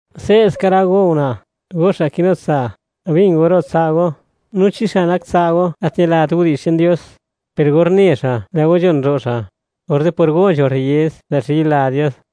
Se'ska rë go una', go xa' kinu tsa'; bin go ro' tsa' go. No chi xa' nak tsa' go gat ñilat widi'zh che'n Dios, per or ne xa', lë' go nzhon ro' xa', orze' por go nzho rriez, lë' xa' yila Dios,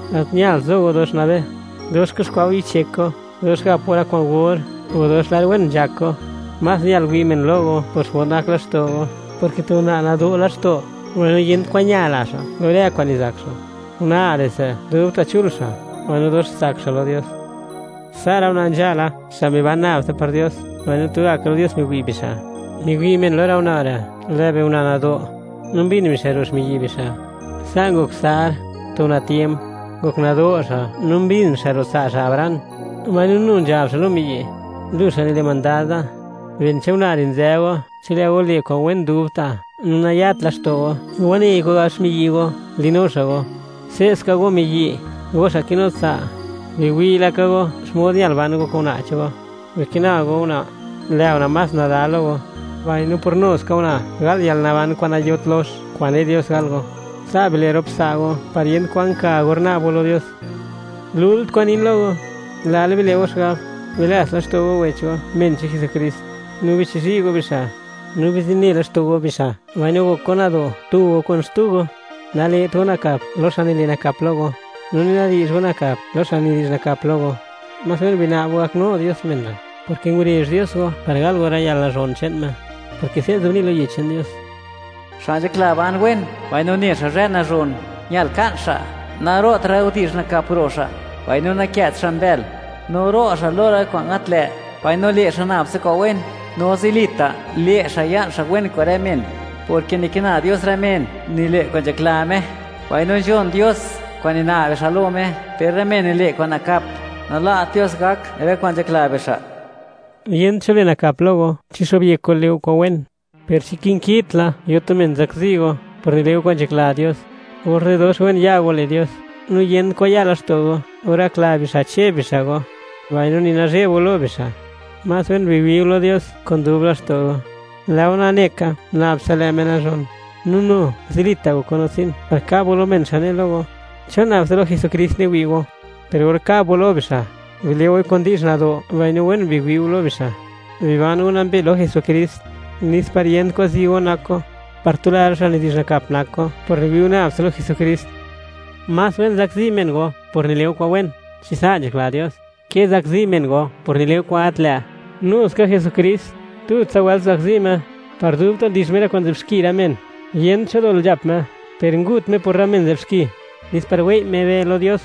Gat ñalt zo go dox nabe: dox kuxkwa' go yichyek go, dox gap go rë kwa'n or, o dox lar wen nzhak go. Más ñal wi' men lo go por xmod nak laxto' go, porke tu una' nado' laxto', mbaino yent kwan ña la xa' lo rë kwa'n nizak xa'; una' re'se' dubta' chul xa', mbaino dox tsak xa' lo Dios. Sa' rë una' nzhala, xa' miban nab tsa par Dios, mbaino tugaka lo Dios miwi' bixa'; miwi' men lo rë una' re', lë' biuna' nado', no mbin bixa' ro' xmiyi' bixa'. Sa' ngok Sar, tu una' tiemp; ngok nado' xa' no mbin xa' ro' tsa' xa' Abraham, mbaino nu nzhab xa' lo miyi': “Lu xa' nile' mandad da.” Ben che'n una' re' nzë go, chi lë' go le' kwa'n wen dubta' no nayat laxto' go lo wanei kwan gab xmiyi' go li'nu xa' go. Se'ska go miyi', go xa' kinu tsa'; biwi' laka go xmod ñal ban go kun una' che'n go. Bikina go una', lë' una' más nada (delikad) lo go, mbaino por nu ska una' gal yalnaban kwa'n nayot lox, kwa'n ne' Dios gal go. Sa' bile' rop tsa' go par niyent kwan ka or na'b go lo Dios. Lult kwa'n nin lo go; lal bile' go xigab, bilats laxto' go wech go, men che'n Jesukrist, no bichizhi' go bixa'; no bizine laxto' go bixa' mbaino gok go nado', tu go kun xtu go. Nale't go nakap lo xa' nile' nakap lo go, no ni nadi'zh go nakap lo xa' nidi'zh nakap lo go; más wen guna'b go gaknu Dios men re', porke ngurezh Dios go par gal go rë yalnazhon che'n Me, porke se' nzobni' lo Yech che'n Dios: Xa' nzhakla ban wen, mbaino ne xa' zhë nazhon, ñal ka'n xa', naro'tra' rë widi'zh nakap ro' xa', mbaino nakë't xa' mbël. No ro' xa' lo rë kwa'n gat lë', mbaino le' xa' nab tsa kwa'n wen. No zilita' le' xa' ya'n xa' wen kun rë men, porke nikina Dios rë men nile' kwa'n nzhakla Me, mbaino nzhon Dios kwa'n nina'b bixa' lo Me. Per rë men nile' kwa'n nakap, nalat Dios gak rë kwa'n nzhakla bixa'. Yent cho le' nakap lo go chi xo'byek go le' go kwa'n wen. Per chi kinkitla yo tu men zakzi go por nile' go kwa'n nzhakla Dios, orze' dox wen ya go le' Dios, no yent kwan ya laxto' go or gakla bixa' che'b bixa' go, mbaino ni nazheb go lo bixa'. Más wen biwi' go lo Dios kun dub laxto' go, lë' go nane ka, nab tsa lë' Me nazhon; no nu zilita' gok go natsin par kab go lo men xa' ne lo go: “¿Chon nab tsa lo Jesukrist niwi' go?” Per or kab go lo bixa', bile' goi kun di'zh nado' mbaino wen biwi' go lo bixa'. Biban go nambe lo Jesukrist, nes par yent kwan zi go nak go, par tula rë xa' nidi'zh nakap nak go por niwi' go nab tsa lo Jesukrist. Más wen zakzi men go por nile' go kwa'n wen, chi sa' nzhakla Dios, ke zakzi men go por nile' go kwa'n gat lë'. Nuska Jesukrist, tutsa wëlt nguzakzi Me, par dubta' ndix Me rë kwa'n nzë'b xki rë men; yent cho dol nzhap Me, per ngut Me por rë men nzë'b xki, nes par wei' Me be lo Dios.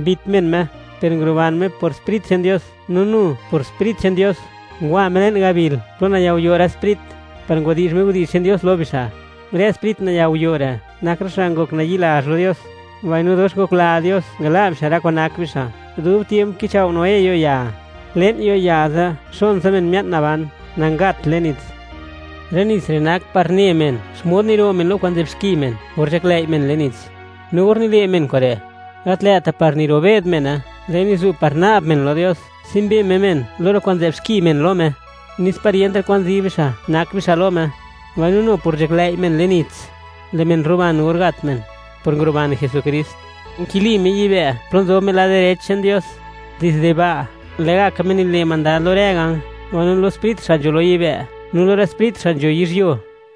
Mbit men Me, per nguruban Me por Sprit che'n Dios. No nu, por Sprit che'n Dios, ngwa Me le'n gabil plo nayao'yo' rë sprit, par ngwadi'zh Me widi'zh che'n Dios lo bixa'. Rë sprit nayao'yo' re' nak rë xa' ngok nayi'lazh lo Dios; mbaino dox ngokla Dios ngala' bixa' rë kwa'n nak bixa' dub tiemp kichao' Noé yo'ya. Le'n yo'ya ze' xon tsa men mia'n naban, nangat le'n nits. Rë nits re' nak par ne men, xmod niro' men lo kwa'n nzë'b xki men or nzhaklëi' men le'n nits. No or nile' men kure', gat lë'ta' par niro'be'd mene; lë'i nizu' par na'b men lo Dios, tsimbe Me men lo rë kwa'n nzë'b xki men lo Me, nes par yentra' kwan zi bixa' nak bixa' lo Me. Mbaino nu por nzhaklëi' men le'n nits, lë' men ruban or gat men, por nguruban Jesukrist. Nkili Me yibë', plo nzob Me lad direch che'n Dios. Dizde ba', lë'gaka Me nile' mandad lo rë ganj, mbaino lo rë sprit xa' nzho lo yibë' no lo rë sprit xa' nzho yizhyuo.